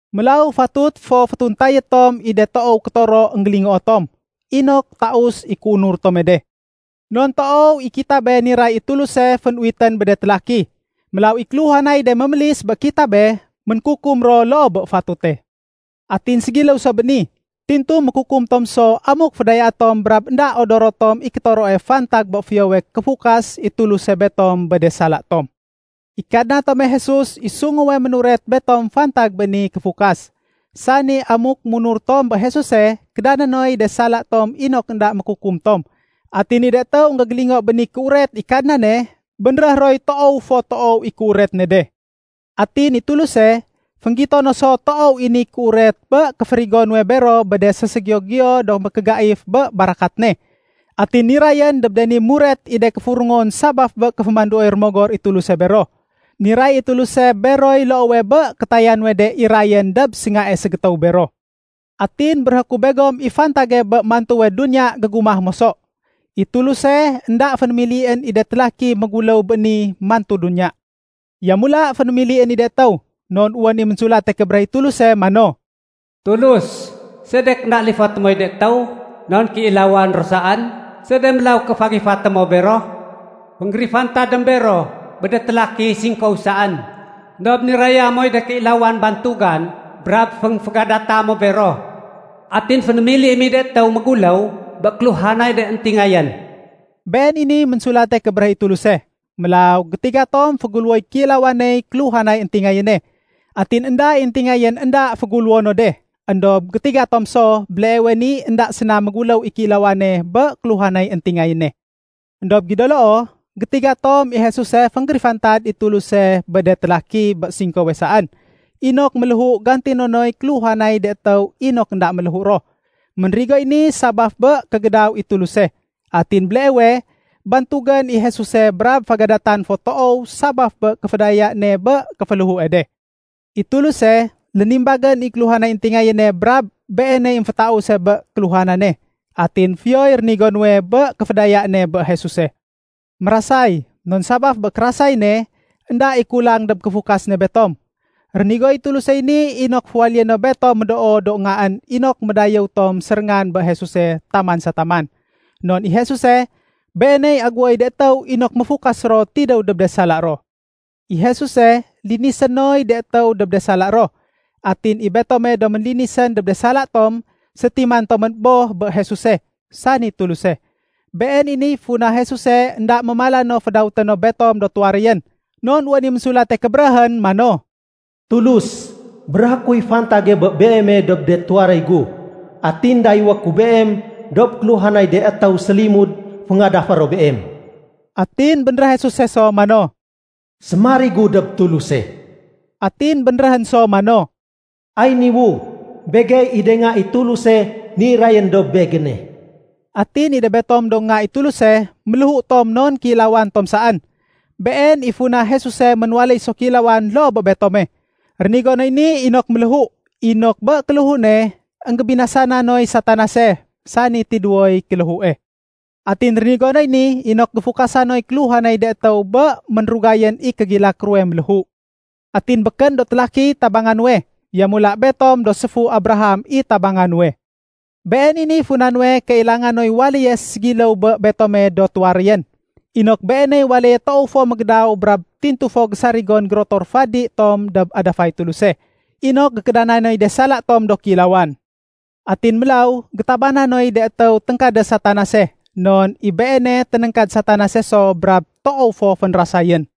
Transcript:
Mélaw fatut fo fétuntayé tom i de toow kétoro énggélingoo tom, inok taus i kéunur tome de. Non toow i kitabe niray i Tuluse fénuwitén bé de télaki. Mélaw i kéluhanay de mémélis bé kitabe, ménkukum ro loo bé fatute. Atin ségiléw so bé ni, tintu mékukum tom so amuk fédayaé tom brab énda odoro tom i kétoroe fantag bé fiyowe kéfukas i Tuluse betom bé de sala tom. I Kadna tome Jesus i sunguwe ménuret betom fantag bé ni kéfukas, sani amuk munur tom bé Jesuse, kédané noy de sala tom inok énda mékukum tom. Atin i de étéw énggégélingo bé ni kéuret i Kadnane, bénréh roy toow fo toow i kéuret ne de. Atin i Tuluse, fénggito no so toow i ni kéuret bé kéférigo nuwe bero do ségiyo-giyo do mékégaif bé barakat ne. Atin nirayén dob de ni muret i de kéfurungon sabaf bé kéfémanduoy Rémogor i Tuluse bero. Niray i Tuluse beroy loowe bé kétaya nuwe de irayén dob séngae ségétéw bero. Atin béréhé ku begom i fantage bé mantuwe duniya gégumah moso. I Tuluse, énda fénémilién i de télaki méguléw bé ni mantu duniya. Yamula fénémilién i de étéw. Non wén i Ménsulate Kébéréh i Tuluse mano, “Tulus, sedek énda lifoté moy de étéw? Non kéilawan ro saén. Sede mélaw ké fagifaté mo bero? Fénggérifantadém bero bé de télaki singkow saén. Endob niraya moy de kéilawan bantugan brab fénfégadata mo bero. Atin fénémiliém i de étéw méguléw bé kéluhanay de éntingayén.” Been i niy Ménsulate Kébéréh i Tuluse. Mélaw gétiga tom féguléwoy kéilawaney kéluhanay éntingayéne, atin énda i éntingayén énda féguléwo no de. Endob gétiga tom so, béleewe ni énda séna méguléw i kéilawane bé kéluhanay éntingayéne. Endob gido loo, gétiga tom i Jesuse fénggérifantad i Tuluse bé de télaki bé singkowe saén inok méléhu gantino noy kéluhanay de étéw inok énda méléhu ro. Ménrigoy ni sabaf bé kégédaw i Tuluse. Atin béleewe, bantugén i Jesuse brab fégadatan fo toow sabaf bé kéfédaya ne bé kéféléhue de. I Tuluse, lénimbagén i kéluhanay éntingayéne brab Beeney émfétause bé kéluhanane. Atin fiyoy rénigo nuwe bé kéfédaya ne bé Jesuse. Mérasay, non sabaf bé kérasay ne, énda i kulang dob kéfukas ne betom. Rénigoy Tulusey ni inok féwaléyé no betom médoo do ngaén inok médayéw tom séréngan bé Jesuse taman sa taman. Non i Jesuse, Beeney aguwoy de étéw inok méfukas ro tidéw dob de sala ro. I Jesuse, linisé noy de étéw dob de sala ro. Atin i betome do ménlinisén dob de sala tom, sétiman tomén Boh bé Jesuse, sani Tuluse. Been i niy funa Jesuse énda mémala no fédawété no betom do tuwaréyén. Non wén i Ménsulate Kébéréhén mano, “Tulus, béréhé kuy fantage bé Beeme dob de tuwaréy gu. Atin dayéwé ku Beem dob kéluhanay de étéw sélimud féngadafé ro Beem.” Atin bénréh Jesuse so mano, “Sémarigu dob Tuluse.” Atin bénréhén so mano, “Ay niwu, begey i de nga i Tuluse nirayén dob Begéne.” Atin i de betom do nga i Tuluse, méléhu tom non kéilawan tom saén. Been i funa Jesuse ménwaléy so kéilawan loo bé betome. Rénigo noy ni inok méléhu, inok bé kéléhu ne, énggébinasana noy Satanase, sani tidéwoy kéléhue. Atin rénigo noy ni inok géfukasa noy kéluhanay de étéw bé ménrugayén i kégilak ruwe méléhu. Atin békén do télakiy tabanga nuwe. Yamula betom do séfu Abraham i tabanga nuwe. Been i niy funa nuwe kailanga noy waléye ségiléw bé betome do tuwaréyén, inok Beeney waléye toow fo mégédaw brab tintu fo gésarigon gérotor fadi tom dob adafay Tuluse, inok gékédana noy de sala tom do kéilawan. Atin mélaw, gétabana noy de étéw téngkadé Satanase, non i Beene ténéngkad Satanase so brab toow fo fénrasayén.